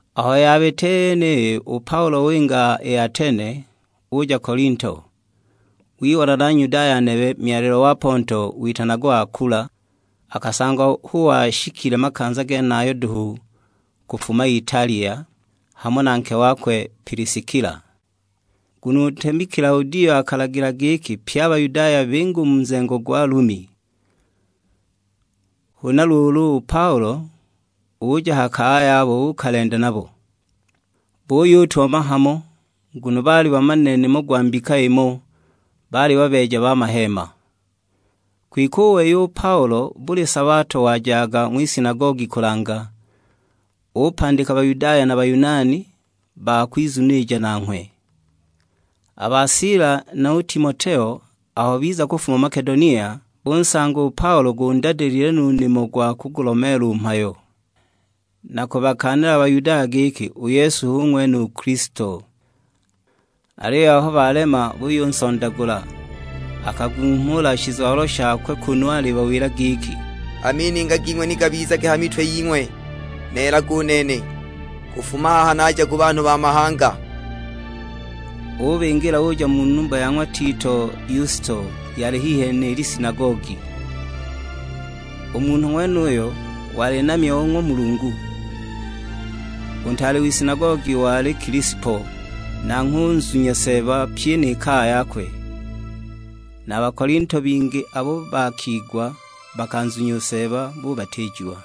Aho yabita i yeniyi u Paulo winga i Atene, uja Kolinto. Wibona na Nyudaya nebe myalilwa wa Ponto, witanagwa Akula; akasangwa hu washikile makanza genayo duhu kufuma Italia, hamo na nke wakwe Piliskila. Nguno u ntemi Kilaudio akalagila giki pye a Bayudaya binge u mu nzengo gwa Lumi. Huna luulu u Paulo uja ha kaya yabo uukalenda nabo. Buyutumama hamo, nguno baali bamanile nimo gwa mbika imo; baali babeeja ba maheema. Kwike u wei u Paulo buli sabato wajaga ng'wisinagogi kulanga; upandika Bayudaya na Bayunani ba kwizunilija nanghwe. A ba Sila nu Timoteo aho biza kufuma i Makedonia, bunsanga u Paulo gundadilile no u nimo gwa kugulomeela u mhayo, na kubakaanila a Bayudaya giki u Yesu hu ng'wene u Kilisto. Aliyo aho balema buyunsondagula, akagunghumula shizwalo shakwe kunu alibawila giki, "A mininga ging'we ni gabizage ha mitwe ying'we, neelaga u nene. Kufuma haha naja ku banhu ba mahanga!" Ubingila uja mu numba ya ng'wa Tito Yusto, yali hihi ni lisinagogi. U munhu ng'wenuyo wali namya o ng'wa Mulungu. U ntaale w'isinagogi wali Kilispo, nanghwe unzunya Seeba pyi ni kaya yakwe; na Bakolinto bingi abo bakigwa bakanzunya u Seeba bubatiijiwa.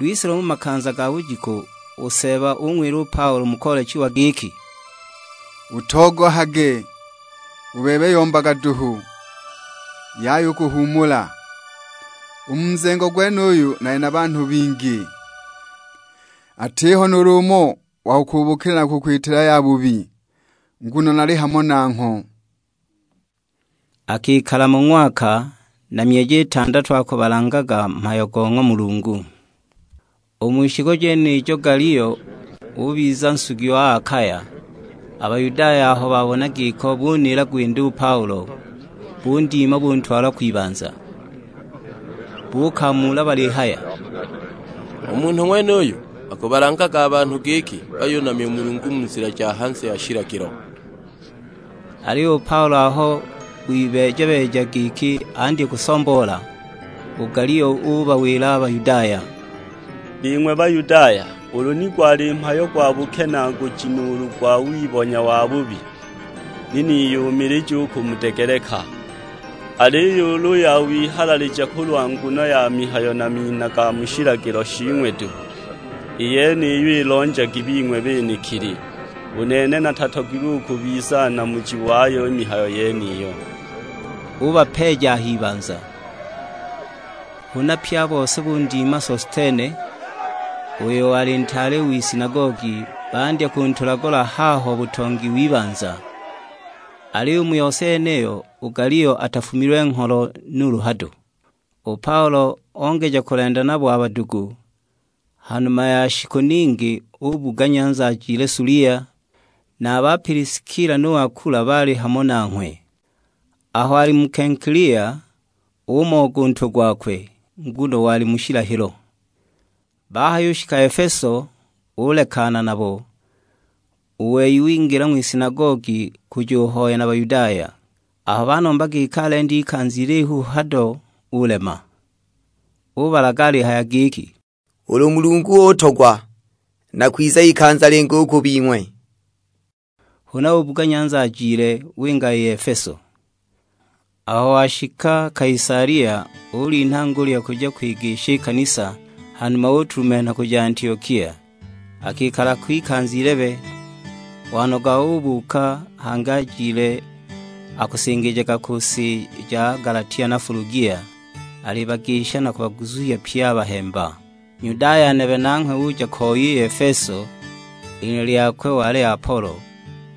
Lwise lumo makanza ga bujiku u Seeba ung'wila u Paulo mu koolechiwa giki, "Utogohage; u bebe yombaga duhu, yaya u kuhuumula. U mu nzengo gwenuyu nali na banhu bingi, atiho nuulu umo wa kukuubukila na kukwitila yabubi, nguno nali hamo nangho." Akikala mo ng'waka na myeji itandatu akubalangaga mhayo go ng'wa Mulungu. U mu shiku jenijo Galio ubiza nsugi wa Akaya, a Bayudaya aho babona giko buniila gwinda u Paulo, bundima buntwala kwibanza. Buukamuula balihaya, "U munhu ng'wenuyu akubalangaga a banhu giki bayunamya u Mulungu mu nzila ja hanze ya shilagilo!" Aliyo u Paulo aho wibeeja-beeja giki andye kusomboola, u Galio ubawila a Bayudaya, "Bing'we Bayudaya, ulu ni gwali mhayo gwa bukenaaguji nuulu gwa wibonya wabubi, ni niyumilija u kumudegeleka. Aliyo ulu ya wihalalija kulwa nguno ya mihayo na mina ga mu shilagilo shing'we duhu, i yeniyo ilonjagi bing'we benekili. U nene natatogilwe u kubiza namuji wayo i mihayo yeniyo." Ubapeeja a h'ibanza. Huna pye a bose bundima Sostene, uyo wali ntaale w'isinagogi; bandya kuntulagula haho butongi w'ibanza. Aliyo u mu yose yeniyo, u Galio atafumilwe ngholo nuulu hado. U Paulo ongeja u kulenda nabo a badugu. Ha numa ya shiku ningi ubuga nyanza ajile Sulia, na a ba Piliskila nu Akula baali hamo nanghwe. Aho ali mu Kenkilia umooga u ntwe gwakwe, nguno wali mu shilahilo. Bahayushika Efeso ulekana nabo, u wei wingila ng'wisinagogi kujuhoya na Bayudaya. Aho banomba giki alende ikanza ilihu ho hado ulema. Ubalaga alihaya giki, "Ulu Mulungu utogwa, nakwiza ikanza lingi u ku bing'we." Huna ubuga nyanza ajile, winga i Efeso. Aho washika Kaisalia ulinha ngulya kuja kwigisha i kanisa, hanuma utulumenha kuja Antiokia. Akikala ko ikanza ilebe; wanoga ubuuka hangi ajile akusingijaga mu si ja Galatia na Fulugia, alibagisha na kubaguzuhya pye a bahemba. Nyudaya nebe nanghwe uja ko i Efeso; i lina lyakwe wali Apolo,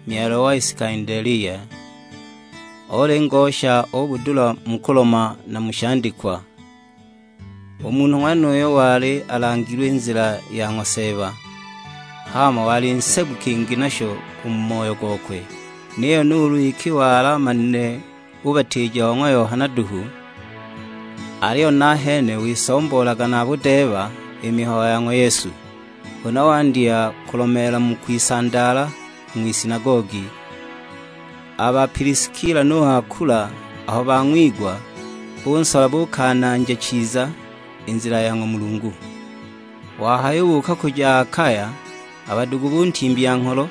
myalilwa wa Isikandelia. Oli ngosha o budula mu kuloma na mu shandikwa. U munhu ng'wenuyo wali alangilwe i nzila ya ng'wa Seeba, hama wali nsebu kingi nasho u mu moyo gokwe. Niyo nuulu iki wali amanile bubatiija bo ng'wa Yohana duhu, aliyo nahene wisomboolaga na budeeba i mihayo ya ng'wa Yesu. Huna wandya kulomeela mu kwisandaala u ng'wisinagogi; a ba Piliskila nu Akula aho bang'wigwa, bunsola buukananja chiza i nzila ya ng'wa Mulungu. Wahayubuuka kuja Akaya, a badugu buntimbya ngholo,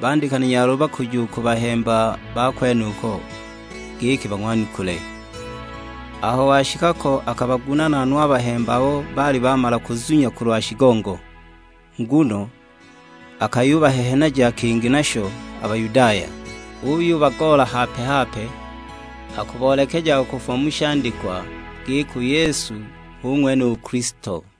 bandika na nyaluba kuja u ku bahemba ba kwenuko giki bang'wanukule. Aho washika ko, akabagunaana no a bahemba abo baali bamala kuzunya kulwa shigongo. Nguno akayubahehenaja kingi nasho a Bayudaya; uyubagoola hape-hape, akuboolekejaga kufuma mu shandikwa, giki u Yesu hu ng'wene u Kilisto.